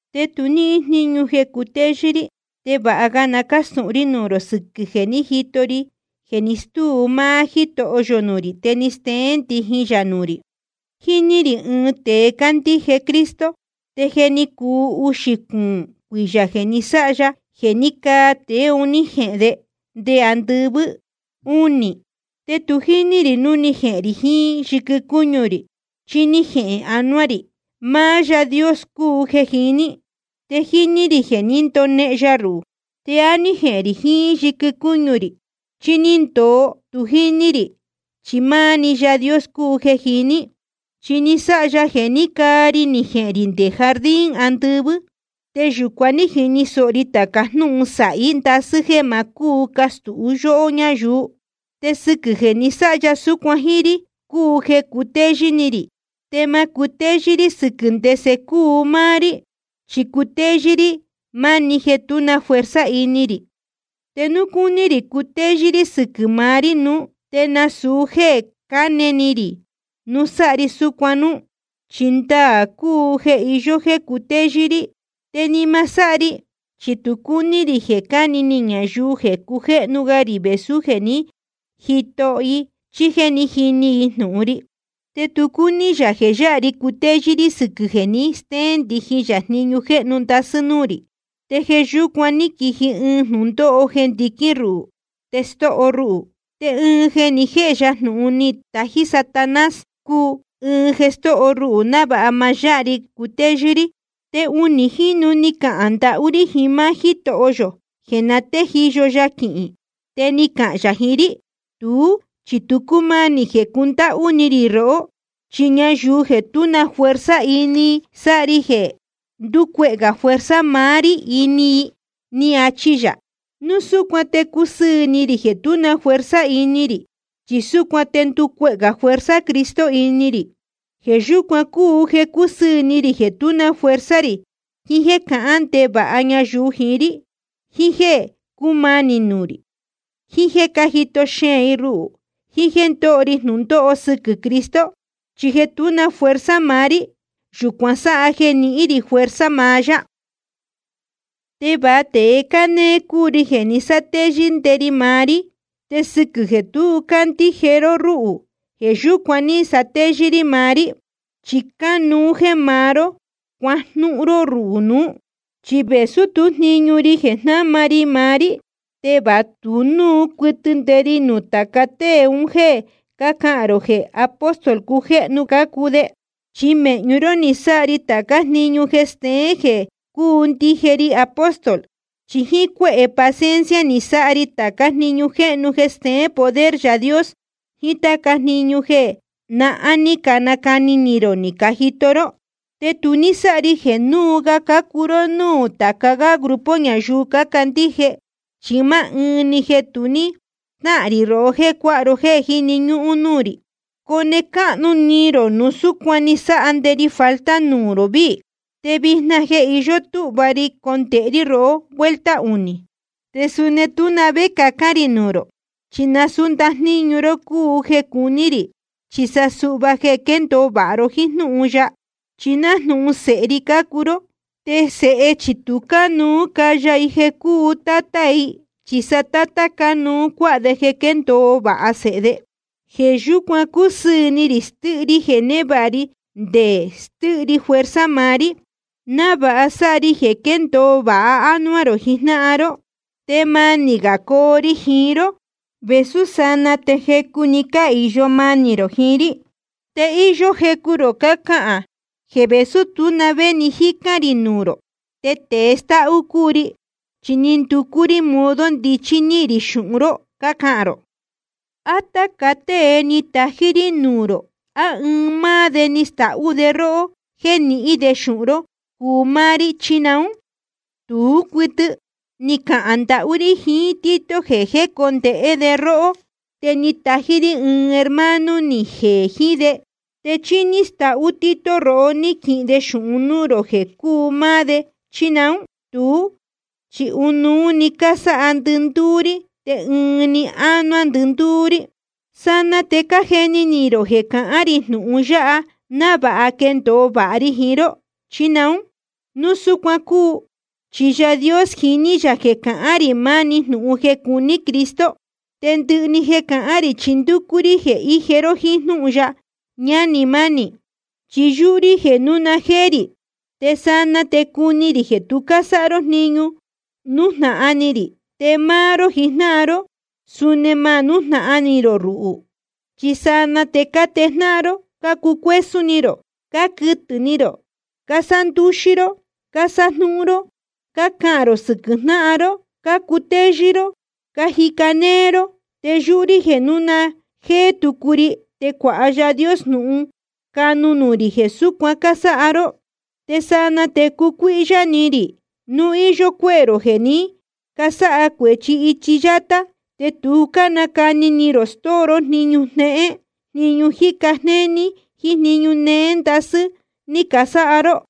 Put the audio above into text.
Te tu níhín jníñu jeē cutéyɨ́ rí. Te vāha ga na cástūhun rí nuū rō sɨquɨ̄ jeē ní jito ri jeē ni stúu maá Jítoho yō nuū rī te ni steén ndijin yā nuū rī. Jíní rī ɨɨn tēe cándíje Cristo, te je ni cuu uxī cuūn cuiyā jeē ní sáha ya jeē ní caa tēe un ní jehēn de nde andɨvɨ́ únī. Te tu jíní rī núu ni jehēn rī jiín yɨquɨ cúñu rī, chí ní jehēn anuá‑ni ri. Máá Yaā Dios cúu jeē jiní. Te jíní rī jeē ní ndonehen ya ruhū. Te á ní jehēn rī jiín yɨquɨ cúñu rī, chí ní ndōo, tu jíní rī, chi máá‑ni Yaā Dios cúu jeē jiní. Chi ni sáha ya jeē ní caa ri ni jehēn rī nde jardín andɨvɨ́. Te yūcuan ní jini sōho ri tāca jnúhun sāhí ndasɨ́ jéē ma cúu castūhun yóhó ñáyuu. Te sɨquɨ̄ jeē ni sáha ya súcuan jíín rí cúu jeē cutéyɨ́ rí, te ma cutéyɨ́ rí sɨquɨ̄ ndese cúu máá rí. Chi cutéyɨ́ rí máni jeē tú na fuerza ini rī. Te núu cúní rī cutéyɨ́ rí sɨquɨ̄ maá rí nuú, te nasūu jéē canéé rí núu sáha ri súcuan núú, chi ndaā cúu jeē iyó jeē cutéyɨ́ rí. Te ni ma sáha ri, chi tu cúní rī jeē cani ni ñayuu jeē cujéhnu ga rī vēsú jeē ní jito i chí jéē ní jini i jnūhun ri. Te tu cúní yā jeē yáha ri cutéyɨ́ rí sɨquɨ̄ jeē ni stéén ndijin yā jniñu jéhnu ndasɨ́ un núū rī, te jeē yúcuan ni quiji ɨɨn jnūndóho jeē ndiquín ruhū te stóho ruhū. Te ɨɨn jeē ni jéhe ya jnūhun ni tají Satanás cúu, ɨɨn jeē stóho ruhū, návāha ma yáha ri cutéyɨ́ rí. Te unī jínu ni cahān ndahú rí jiín máá Jítoho yō jeē na téjiyo ya quihīn. Te ni cahān yā jiín rí: Tuú chi tu cúmanī jeē cundáhú ni rī rohó. Chi ñayuu jeē tú na fuerza ini, sáha ri jeē nducuehē gā fuerza maá rí ini i, ni achi yā. Núu súcuan te cúsɨɨ̄ ni rī jeē tú na fuerza ini rī, chi súcuan te nducuehē gā fuerza Cristo ini rī. Jeē yúcuan cúu jeē cúsɨɨ̄ ni rī jeē tú na fuerza rī, jiín jéē cácahān ndevāha ñayuu jiín rí, jiín jéē cúmanī nuū rī, jiín jéē cájito xeēn i ruhū, jiín jéē ndóho ri jnūndóho sɨquɨ̄ Cristo. Chi jeē tú na fuerza maá rí, yūcuan sáha jeē nihín rī fuerza maá yá. Te va tēe cánéé cúu ri jeē ni sátéyɨ́ nde ri maá rí. Te sɨquɨ̄ jeē tu cácandíje ró rúhū, jeē yúcuan ní satéyɨ́ rí maá rí. Chi cánuú jéē máá ró cuajnúhún ró ruhū nuú. Chi vēsú tú jniñu ri jeē maá rí, te va tu núu cuɨtɨ nde ri nuū tāca tée un jéē cácahān rō jeē apóstol cujéhnu cácuu de. Chi mēhñu ró ní sáha ri tācá jniñu jeē steén jeē cúu ndije ri apóstol. Chi jíín cuéhē paciencia ni sáha ri tācá jniñu jéhnu jeē steén poder Yaā Dios, jíín táca jniñu jeē nahán ní canaa ni rō ni cajito ró. Te tu ní sáha ri jeē núu ga cácuu ró núū tāca gá grupo ñayuu cácandíje, chi máá ɨɨn‑ni jeē tu ní stáhān rī rohó jéē cuáha ro jéē jíni ñúhún rí. Cone cáhnu ni rō núu súcuan ni sáha nde ri falta nuū rō víī. Te vijna je íyó túhva ri jecondēhe rí rohó vuelta unī. Te suni tú na vé cacán rī nuū rō, chi nasūú ndajníñu ró cúu jeē cuní rī, chi sa suhva jeē quendōo vāha ró jíín jnúhun ya. Chi nájnūhun sēhe ri cácuu ró, te sēhe chi tu cánuú caya i jeē cúu tátá i, chi sa tátá cánuú cuāha de jeē quéndōo vāha sēhe de. Jeē yúcuan cúsɨɨ̄ ni rī stɨ́hɨ ri jeē névāha ri, te nde stɨ́hɨ ri fuerza maá rí, návāha sáha ri jeē quéndōo vāha ánuá rō jijnáhan ró. Te manī gā coo ri jiín ró, vēsú sanaa te jecu‑ni cáhīyo manī rō jiín rí. Te íyó jecu rō cácahān jeē vēsú tú na vé ni jícán rī nuū rō, te tēe stáhú cúu ri, chi ni nducú rí modo ndichí nihīn rī xūhun ró, cácahān rō. ¿A táca tée ní tají rí nuū rō, á ɨɨn máá de ni stahú de róhó jéē nihín de xūhun ró cuu máá rí, chí naún? Tú cuɨtɨ. Ni cahān ndahú rí jiín Tito jeē jécondēhé de róhó, te ni tají rí ɨɨn hermano ni jeē jiín de. ¿Te chí ní stahú Tito rohó ní quihin de xūhun núū rō jeē cuu máá de, chí naún? Tuú chi ɨnuú‑ni cásáha ndɨndúú rí, te ɨɨn‑ni ánuá ndɨndúú rí. ¿Sanaa te cájeni ni rō jeē cahán rī jnūhun yáha návāha quendōo vāha ri jiín ró, chí naún? Nasūu súcuan cúu, chi Yaā Dios jiní yā jeē cahán rī maá‑ni jnūhun jeē cuní Cristo. Te ndɨhɨ jeē cahán rī chi ndúcú rí jeē ije ró jíín jnúhun ya, ñánī mánī. Chi yúhú rí jeē núu na jéé rī, te sanaa te cuni rī jeē tu cásáha ró jniñu nújnahan ni rī. Te máá ró jijnáhan ró, suni ma nújnahan ni rō ruhū. Chi sanaa te cátejnáhan ró, cácucuésún ni rō, cáquɨtɨ̄ ni rō, cásándúxí ró, cásájnúhún ró, cácahān rō sɨquɨ̄ jnáhan ró, cácutéyɨ́ ró, cájica néé ró. Te yúhú rí jeē núu na jéé tucu ri te cuāha Yaā Dios jnūhun canu nuū rī jeē súcuan cásáha ró. Te sanaa te cucuíhyá ni rī núu íyó cuéhē rō jeē ní casáha cuēchi ichi yátá, te tu nácani ni rō stóo ró jniñu jnéhén jniñu jíca jnéní jíín jniñu néé ndasɨ́ ní casáha ró.